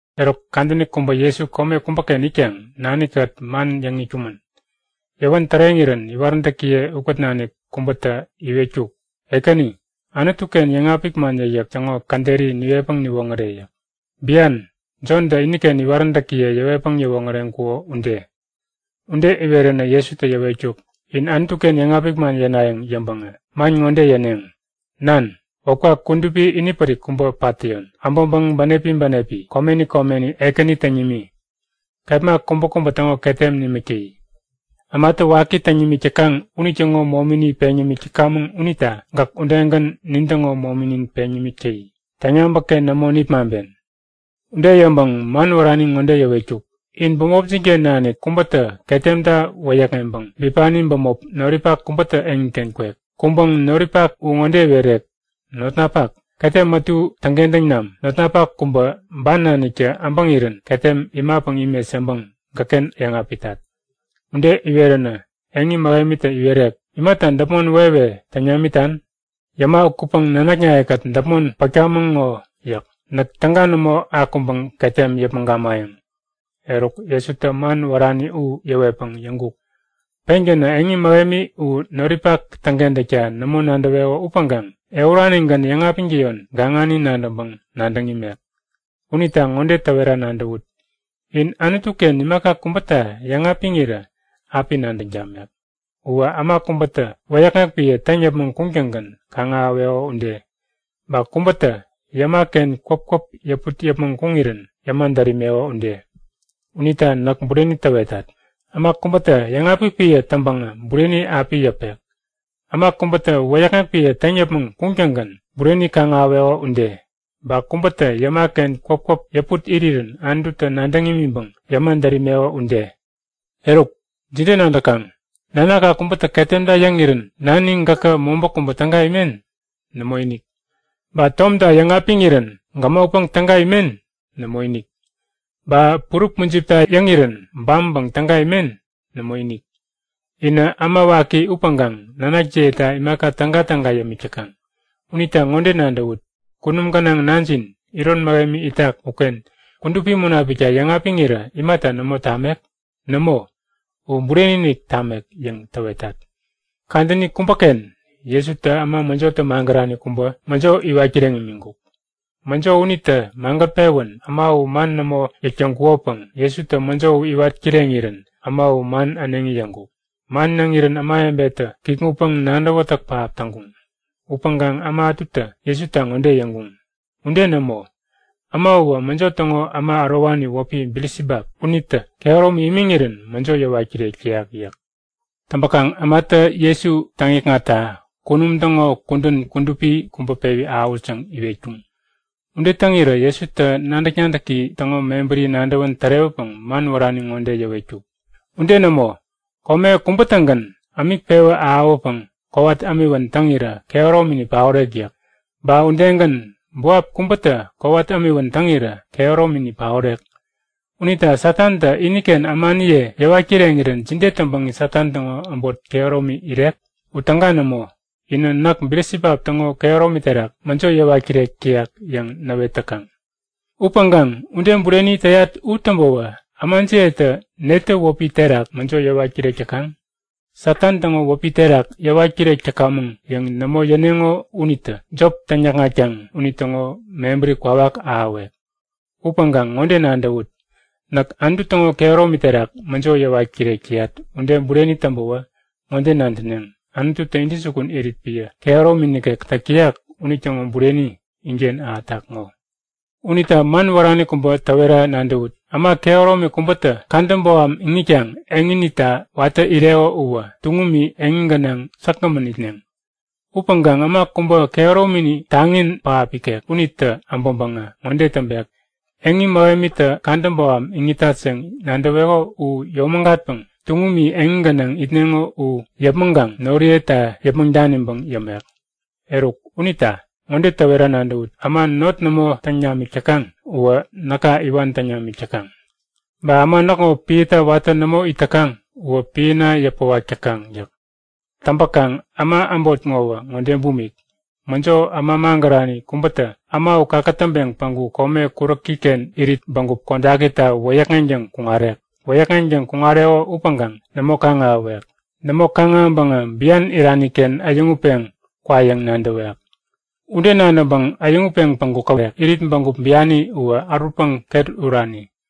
Eruk kadäni kubä Jesu kome kubäken itkaŋ nani-kät man yäŋ itkumän. Yäwän täreŋirän iwaräntäkiye ukät nanik kubätä iwetkuk; Ekäni, Anutu-ken yäŋapik man yäkyäk täŋo käderi niwetpäŋ niwoŋäre yäk. Bian, Jontä iniken iwaräntäkiye yäwetpäŋ yäwoŋäreŋkuko ude. Ude iweränä Jesutä yäwetkuk; In Anutu-ken yäŋapik man yänayäŋ yäŋpäŋä man ŋode yäneŋ; Nan, wäpka kudupi inipärik kubä pat täyon. Äbäŋpäŋ bänepi bänepi, komeni komeni Ekäni täŋ nimi. Kepma kubäkubä täŋo ketem nimik täyi. Ämatä waki täŋ nimik täkaŋ unitäŋo momini peŋ yämik täkamäŋ unita gäk udegän nintäŋo mominin peŋ nimik täyi. Täŋyabäk-ken nämo nipmaŋpen. Ude yäŋpäŋ man wärani ŋode yäwetkuk; In bämopjin-ken nanik kubätä ketemta wäyäkŋeŋpäŋ bipani bämop noripak kubätä eŋiken kwek. Kuŋpäŋ noripak u ŋode iwerek; Notnapak, ketem ätu täŋkentäŋ nam. Notnapak kubä, ban naniktä äbäŋirän ketem imapäŋ imet yäŋpäŋ gäkken yäŋapitat. Ude iweränä eŋi mähemitä iwerek; Imata däpmon wewe täŋ namitan? Yäma ukätpäŋ nanaknaye-kät däpmon pätkamäŋ ŋo yäk. Näk täga nämo akuŋpäŋ ketem yäpmäŋ gamayäŋ. Eruk, Jesutä man wärani u yäwetpäŋ yäŋkuk; Pengänä eŋi mähemi u noripak täŋkentäkta nämo nadäweko upäŋkaŋ ehuranigän yäŋapiŋtäyon gaŋani nadäŋpäŋ nadäŋ imek. Unita ŋode täwera nadäwut; In Anutu-ken imaka kubäta yäŋapiŋirä api nadäŋ tamek. Uwä äma kubätä wäyäkŋek piä täŋ yäpmäŋ kuŋtäŋgän kaŋ-ahäweko ude. Ba kubätä yäma-ken kwäpkwäp yäput yäpmäŋ kuŋirän yäma dät imeko ude. Unita näk bureni täwetat! Äma kubätä yäŋapik piä täŋpäŋä bureni api yäpek, äma kubätä wäyäkŋek piä täŋ yäpmäŋ kuŋtäŋgän bureni kaŋ-ahäweko ude. Ba kubätä yäma-ken kwäpkwäp yäput irirän Anututä nadäŋ imiŋpäŋ yäma dät imeko ude. Eruk, jide nadäkaŋ? Nanakka kubätä ketemta yäŋirän nani gäkä mobä kubä täga imen? Nämoinik! Ba tomta yäŋapiŋirän gämokpäŋ täga imen? Nämoinik! Ba purup mujipta yäŋirän bampäŋ täga imen? Nämoinik! Inä äma waki upäŋkaŋ nanakjiyeta imaka tägatäga yämik täkaŋ. Unita ŋode nadäwut; Kunum gänaŋ Nanjin iron mähemi itak uken Kudupi Munapikta yäŋapiŋirä imata nämo tamek? Nämo, u bureni-inik tamek yäŋ täwetat! Kadäni kubäken Jesutä äma mäjotä magärani kubä mäjo iwat kireŋ imiŋkuk. Mäjo unitä magät-pewän äma u man nämo yäk täŋkukopäŋ Jesutä mäjo u iwat kireŋirän äma u man äneŋi yäŋkuk. Man yäŋirän ämawebetä kikŋutpäŋ nadäwätäk pähap täŋkuŋ. Upäŋkaŋ äma ätutä Jesuta ŋode yäŋkuŋ; Ude nämo! Äma uwä mäjo täŋo äma ärowani wäpi Bilisibap unitä kehäromi imiŋirän mäjo yäwat kirek täyak yäk. Täŋpäkaŋ ämatä Jesu täŋikŋatta kunum täŋo kudän kudupi kubä pewi ahäwut yäŋ iwetkuŋ. Ude täŋirä Jesutä nadäk-nadäki täŋo mebäri nadäwän tärewäpäŋ man wärani ŋode yäwetkuk; Ude nämo! Kome kubä-tägän ämik pewä ahäwäpäŋ kowat ämiwän täŋirä kehäromini paorek yäk. Ba udegän buap kubätä kowat ämiwän täŋirä kehäromini paorek. Unita Satantä iniken ämaniye yäwat kireŋirän jide täŋpäŋ Satan täŋo äbot kehäromi irek? U täga nämo! Inä näk Bilisibap täŋo kehäromi terak mäjo yäwat kirek täyat yäŋ näwet täkaŋ. Upäŋkaŋ ude bureni täyat u täŋpäwä ämajiyetä netä wäpi terak mäjo yäwat kirek täkaŋ? Satan täŋo wäpi terak yäwat kirek täkamäŋ yäŋ nämo yäneŋo unitä jop täŋ-näkŋatkaŋ unitäŋo mebäri kwawak ahäwek! Upäŋkaŋ ŋode nadäwut! Näk Anutu täŋo kehäromi terak mäjo yäwat kirek täyat ude bureni täŋpäwä ŋode nadäneŋ; Anututä intäjukun irit piä kehäromi nikek täk täyak unitäŋo bureni inken ahätak ŋo. Unita man wärani kubä täwera nadäwut; Äma kehäromi kubätä Kadä boham iŋitkaŋ eŋinita watä ireko uwä tuŋumi eŋi gänaŋ säkgämän itneŋ. Upäŋkaŋ äma kubä kehäromini taŋi pähap ikek unitä äbäŋpäŋä ŋode täŋpek; Eŋi mähemitä kadä boham iŋitat yäŋ nadäweko u yomägatpäŋ tuŋumi eŋi gänaŋ itneŋo u yäpmäŋkaŋ noriyeta yäpmäŋ daniŋpäŋ yämek. Eruk unita ŋode täwera nadäwut; Äma not nämo täŋ namik täkaŋ uwä näka iwan täŋ namik täkaŋ. Ba äma näkŋo piäta watä nämo it täkaŋ uwä piäna yäpäwak täkaŋ yäk. Täŋpäkaŋ äma äbot ŋowä ŋode bumik; Mäjo äma magärani kubätä äma u kakätäŋpeŋ päŋku kome kuräki-ken irit bägup kodakita wäyäkŋeŋtäŋ kuŋarek. Wäyäkŋeŋtäŋ kuŋareko upäŋkaŋ nämo kaŋ-ahäwek. Nämo kaŋ-ahäŋpäŋä bian irani-ken äyäŋutpeŋ kwa yäŋ nadäwek. Ude nadäŋpäŋ äyäŋutpeŋ päŋku käwek; Irit bägup biani uwä ärutpäŋ ket urani.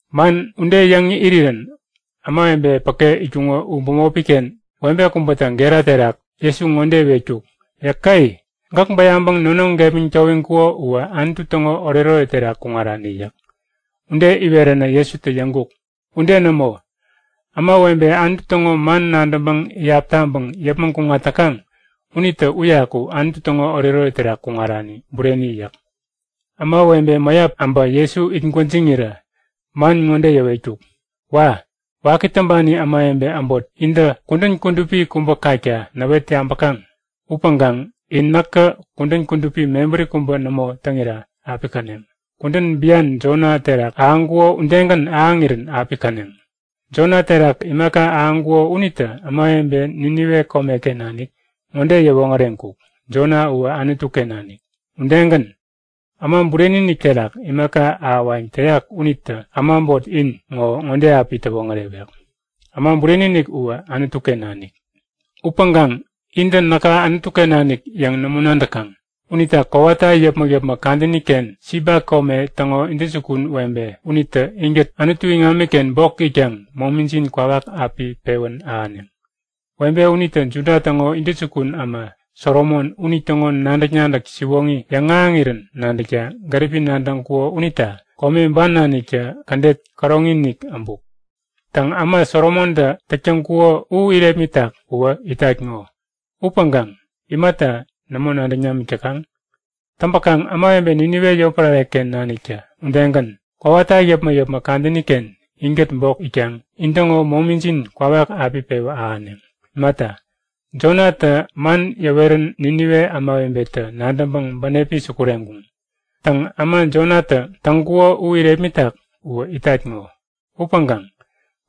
Man ude yäŋ irirän ämawebe päke itkuŋo u bämopi-ken webe kubätä gera terak Jesu ŋode iwetkuk; Yäke! Gäk bäyaŋpäŋ nonoŋ gepmäŋ towiŋkuko uwä Anutu täŋo oretoret terak kuŋarani! yäk. Ude iweränä Jesutä yäŋkuk; Ude nämo! Ämawebe Anutu täŋo man nadäŋpäŋ iyap taŋpäŋ yäpmäŋ kuŋat täkaŋ unitä uyaku Anutu täŋo oretoret terak kuŋarani bureni yäk. Ämawebe mäyap äbä Jesu it gwäjiŋirä man ŋode yäwetkuk; Wa! Waki täŋpani ämawebe äbot intä kudän kudupi kubä kakta näwet yabäkaŋ. Upäŋkaŋ in näkä kudän kudupi mebäri kubä nämo täŋira api käneŋ. Kudän bian Jona terak ahäŋkuko udegän ahäŋirän api käneŋ. Jona terak imaka ahäŋkuko unitä ämawebe Ninive komeken nanik ŋode yäwoŋäreŋkuk; Jona uwä Anutu-ken nanik. Udegän, Äma Bureni-inik terak imaka ahäwayäŋ täyak unitä äma äbot in ŋo ŋode api täwoŋärewek; Äma Bureni-inik uwä Anutu-ken nanik. Upäŋkaŋ intä näka Anutu-ken nanik yäŋ nämo nadäkaŋ. Unita kowata yäpmäk-yäpmäk kadäni-ken Siba kome täŋo intäjukun webe unitä inkät Anutu iŋamiken bok itkaŋ momijin kwawak api pewän ahäneŋ. Webe unitä Juda täŋo intäjukun äma Solomon unitäŋo nadäk-nadäk siwoŋi yäŋahäŋirän nadäkta gäripi nadäŋkuko unita kome ban naniktä kädet käroŋi-inik äbuk. Täŋ äma Solomontä täk täŋkuko u irepmitak uwä itat ŋo! Upäŋkaŋ imata nämo nadäŋ namik täkaŋ? Täŋpäkaŋ ämawebe Ninive yotpärare-ken naniktä udegän, kowata yäpmäk-yäpmäk kadäni-ken inkät bok itkaŋ intäŋo momijin kwawak api pewä ahäneŋ. Imata, Jonatä man yäwerän Ninive ämawebetä nadäŋpäŋ bänepi sukureŋkuŋ. Täŋ äma Jonatä täŋkuko u irepmitak uwä itat ŋo! Upäŋkaŋ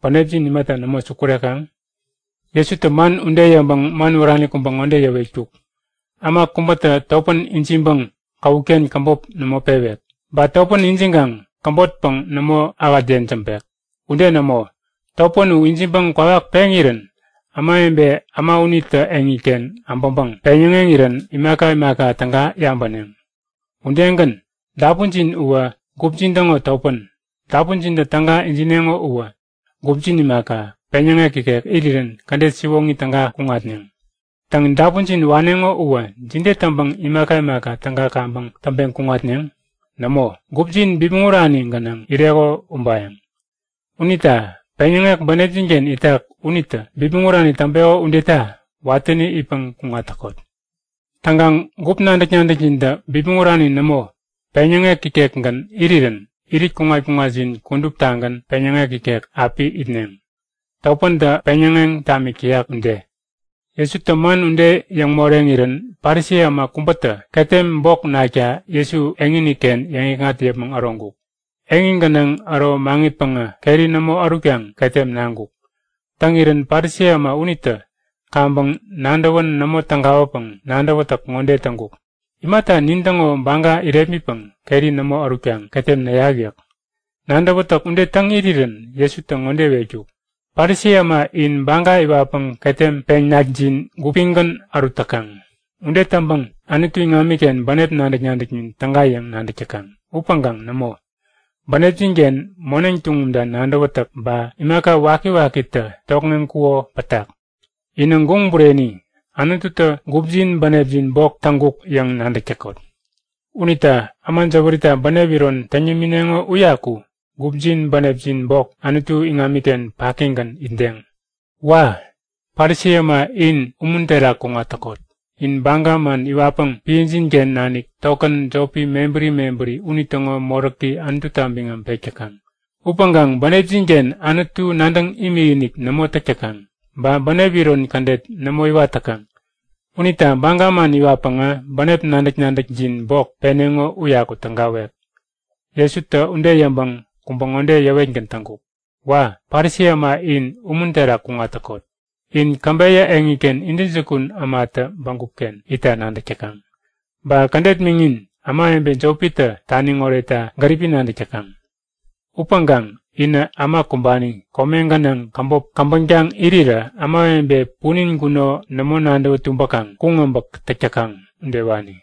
bänepjin imata nämo sukurekaŋ? Jesutä man ude yäŋpäŋ man wärani kubä ŋode yäwetkuk; Äma kubätä topän ijiŋpäŋ käwut-ken käbop nämo pewek. Ba topän ijiŋkaŋ käbotpäŋ nämo ähät yejämbek. Ude nämo! Topän u ijiŋpäŋ kwawak peŋirän ämawebe äma unitä eŋiken abäŋpäŋ peŋyäŋeŋirän imaka imaka täga yabäneŋ. Udegän, dapunjin uwä gupjin täŋo topän. Dapunjintä täga ijineŋo uwä gupjin imaka, peŋyäŋek ikek irirän kädet siwoŋi täga kuŋatneŋ. Täŋ, dapunjin waneŋo uwä jide täŋpäŋ imaka imaka täga kaŋpäŋ täŋpeŋ kuŋatneŋ? Nämo, gupjin bipmäŋ urani gänaŋ ireko ubayäŋ. Unita peŋyäŋek bänepjin-ken itak unitä bipmäŋ urani täŋpeko udeta watäni itpäŋ kuŋat täkot. Täŋkaŋ gup nadäk-nadäkjintä bipmäŋ urani nämo, peŋyäŋek ikekgän irirän irit kuŋat-kuŋatjin kuduptagän peŋyäŋek ikek api itneŋ, topäntä peŋyäŋeŋ tamik täyak ude. Jesutä man ude yäŋ moreŋirän, Parisi äma kubätä ketem bok nakta Jesu eŋini-ken yäŋikŋat yäpmäŋ äroŋkuk. Eŋi gänaŋ äro maŋitpäŋä keri nämo ärutkaŋ ketem naŋkuk. Täŋirän Parisi äma unitä kaŋpäŋ nadäwän nämo tägawäpäŋ nadäwätäk ŋode täŋkuk; Imata nintäŋo baga irepmitpäŋ keri nämo ärutkaŋ ketem näyak yäk. Nadäwätäk ude täŋ irirän Jesutä ŋode iwetkuk; Parisi äma in baga iwatpäŋ ketem peŋ-nakjin gupigän ärut täkaŋ. Ude täŋpäŋ Anutu iŋamiken bänep nadäk-nadäknin täga yäŋ nadäk täkaŋ. Upäŋkaŋ nämo! Bänepjin-ken moneŋ tuŋumta nadäwätäk, ba imaka wakiwakitä tokŋeŋkuko pätak. Inä guŋ bureni! Anututä gupjin bänepjin bok täŋkuk yäŋ nadäk täkot. Unita äma jäwärita bänep iron täŋ yämineŋo uyaku gupjin bänepjin bok, Anutu iŋamiken pakigän itdeŋ. Wa! Parisi äma in umun terak kuŋat täkot! In baga man iwatpäŋ piäjin-ken nanik tokän jopi mebäri mebäri unitäŋo moräki Anututa biŋam pek täkaŋ. Upäŋkaŋ bänepjin-ken Anutu nadäŋ imikinik nämo täk täkaŋ, ba bänep iron kädet nämo iwat täkaŋ. Unita baga man iwatpäŋä bänep nadäk-nadäkjin bok peneŋo uyaku tägawek. Jesutä ude yäŋpäŋ kubä ŋode yäwetgän täŋkuk; Wa! Parisi äma in umun terak kuŋat täkot! In käbeyä eŋiken intäjukun ämatä bägup-ken itta nadäk täkaŋ. Ba kädet miŋin, ämawebe jopitä taniŋ oretta gäripi nadäk täkaŋ. Upäŋkaŋ inä äma kumbani, kome gänaŋ käbop käbäŋtaŋ irirä ämawebe punin guno nämo nadäwä tumbäkaŋ kuŋ äbäk täk täkaŋ udewani.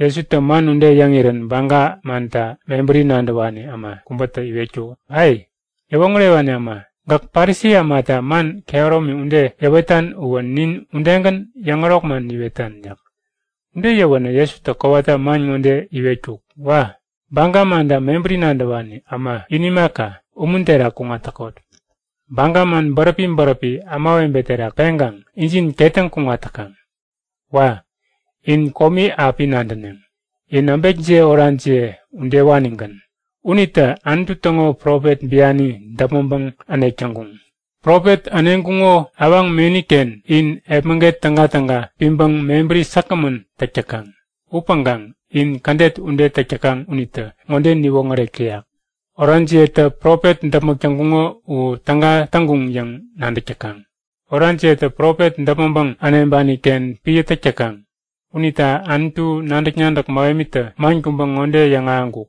Jesutä man ude yäŋirän Baga manta mebäri nadäwani äma kubätä iwetkuk; Ai! Yäwoŋärewani äma, gäk Parisi ämata man kehäromi ude yäwetan uwä nin udegän yäŋärok man niwetan! yäk. Ude yäwänä Jesutä kowata man ŋode iwetkuk; Wa! Baga manta mebäri nadäwani äma in imaka, umun terak kuŋat täkot! Baga man bäräpi bäräpi ämawebe terak peŋkaŋ injin ketäŋ kuŋat täkaŋ. Wa! In komi api nadäneŋ! In äbekjiye orajiye udewanigän. Unitä Anutu täŋo profet biani däpmäŋpäŋ änek täŋkuŋ. Profet äneŋkuŋo awaŋ meni-ken in epmäget tägatäga piŋpäŋ mebäri säkgämän täk täkaŋ. Upäŋkaŋ in kädet ude täk täkaŋ unitä ŋode niwoŋärek täyak; Orajiyetä profet däpmäk täŋkuŋo u täga täŋkuŋ yäŋ nadäk täkaŋ. Orajiyetä profet däpmäŋpäŋ äneŋpani-ken piä täk täkaŋ. Unita Anutu nadäk-nadäk mähemitä man kubä ŋode yäŋahäŋkuk;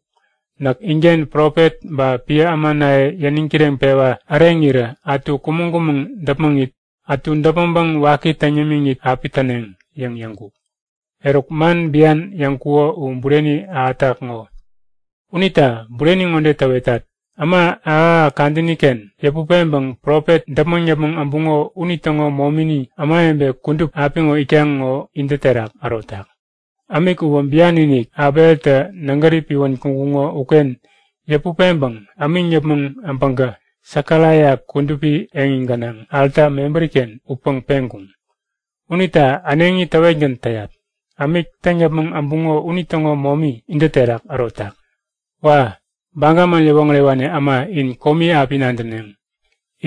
Näk inken profet ba piä ämanaye yäniŋ kireŋpewa äreŋirä ätu kumäŋ-kumäŋ däpmäŋit, ätu däpmäŋpäŋ waki täŋ yämiŋit api täneŋ yäŋ yäŋkuk. Eruk, man bian yäŋkuko u bureni ahätak ŋo. Unita bureni ŋode täwetat; Äma ahäk-ahäk kadäni-ken yäput peŋpäŋ profet däpmäŋ yäpmäŋ äbuŋo unitäŋo momini ämawebe kudup apiŋo itkaŋ ŋo intä terak ärotak. Ämik uwä bian-inik Abeltä nägäri piwän kuŋkuŋo uken yäput peŋpäŋ ämiŋ yäpmäŋ äbäŋkä Sekaraia kudupi eŋi gänaŋ alta mebäri-ken utpäŋ peŋkuŋ. Unita äneŋi täwetgän täyat; Ämik täŋ yäpmäŋ äbuŋo unitäŋo momi intä terak ärotak. Wa! Baga man yäwoŋärewani äma in komi api nadäneŋ.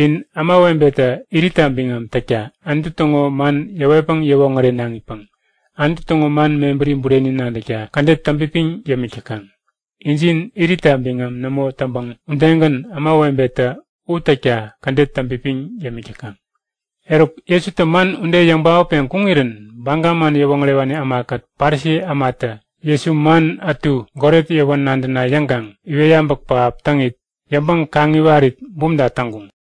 In ämawebetä iritta biŋam täkta Anutu täŋo man yäwetpäŋ yäwoŋärenaŋipäŋ Anutu täŋo man mebäri bureni nadäkta kädet täŋpipiŋ yämik täkaŋ. Injin iritta biŋam nämo täŋpäŋ udegän ämawebetä u täkta kädet täŋpipiŋ yämik täkaŋ. Eruk, Jesutä man ude yäŋ paotpeŋ kuŋirän Baga man yäwoŋärewani ämakät Parisi ämatä Jesu man ätu goret yäwän nadäna yäŋkaŋ iwet yabäk pähap täŋit, yäŋpäŋ-kaŋiwarit bumta täŋkuŋ.